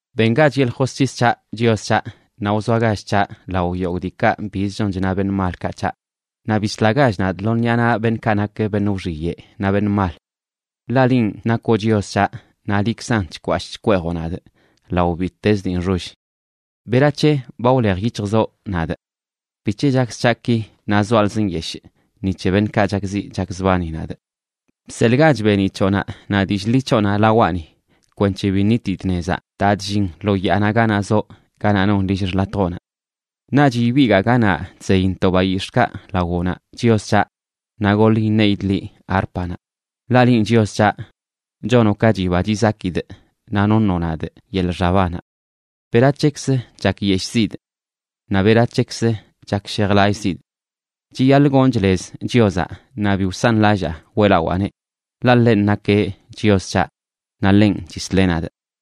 Bengach yeḻꞌ josc̱his c̱haꞌ, Chios c̱haꞌ, naꞌ wzoagach c̱haꞌ lao yogꞌ diikaꞌ biz chon chna beṉꞌ malkaꞌ c̱haꞌ, naꞌ bislagach nadꞌ lo ṉiꞌa naꞌ beṉꞌkaꞌ nak beṉꞌ wxiyeꞌ naꞌ beṉꞌ mal. Ḻaꞌ linꞌ nakoꞌ Chios c̱haꞌ, naꞌ liꞌkzan chkwashꞌ chkweejoꞌ nadꞌ lao bittez dii nxoll. ¿Berac̱he ba wlej yic̱hjzoꞌ nadꞌ? ¿Bic̱he chakz c̱haꞌ ki, naꞌ zoalzꞌ nyeshꞌ ni c̱he beṉꞌkaꞌ chakziꞌ chakzbani nadꞌ? Bseḻꞌgach beeniꞌ c̱hoꞌnaꞌ naꞌ dillꞌ ḻi c̱hoꞌnaꞌ lawaꞌni kwenc̱he bi ṉitidꞌ nezaꞌ daa chllin lo yaanaꞌ ganaꞌ zoꞌ, ganaꞌ non lill xḻatjoꞌnaꞌ. Naꞌch ibigaa ganaꞌ chzeyntoꞌ bayix̱ꞌkaꞌ lawoꞌnaꞌ, Chios c̱haꞌ, naꞌ goḻ iṉeidꞌ liꞌ árpanaꞌ. Ḻaꞌ linꞌ, Chios c̱haꞌ, chonoꞌ ka chiba chizakidꞌ naꞌ noṉoꞌ nadꞌ yeḻꞌ xabanaꞌ. ¿Berac̱hekzə chakyeshꞌzidꞌ naꞌ berac̱hekzə chakshejlallꞌzidꞌ? Chiyaḻꞌ gonchꞌ lez Chiozaꞌ, naꞌ bi wsanlallaa weꞌlawaaneꞌ, ḻaꞌ ḻenꞌ nakeꞌ Chios c̱haꞌ, naꞌ ḻenꞌ chisleꞌ nadꞌ.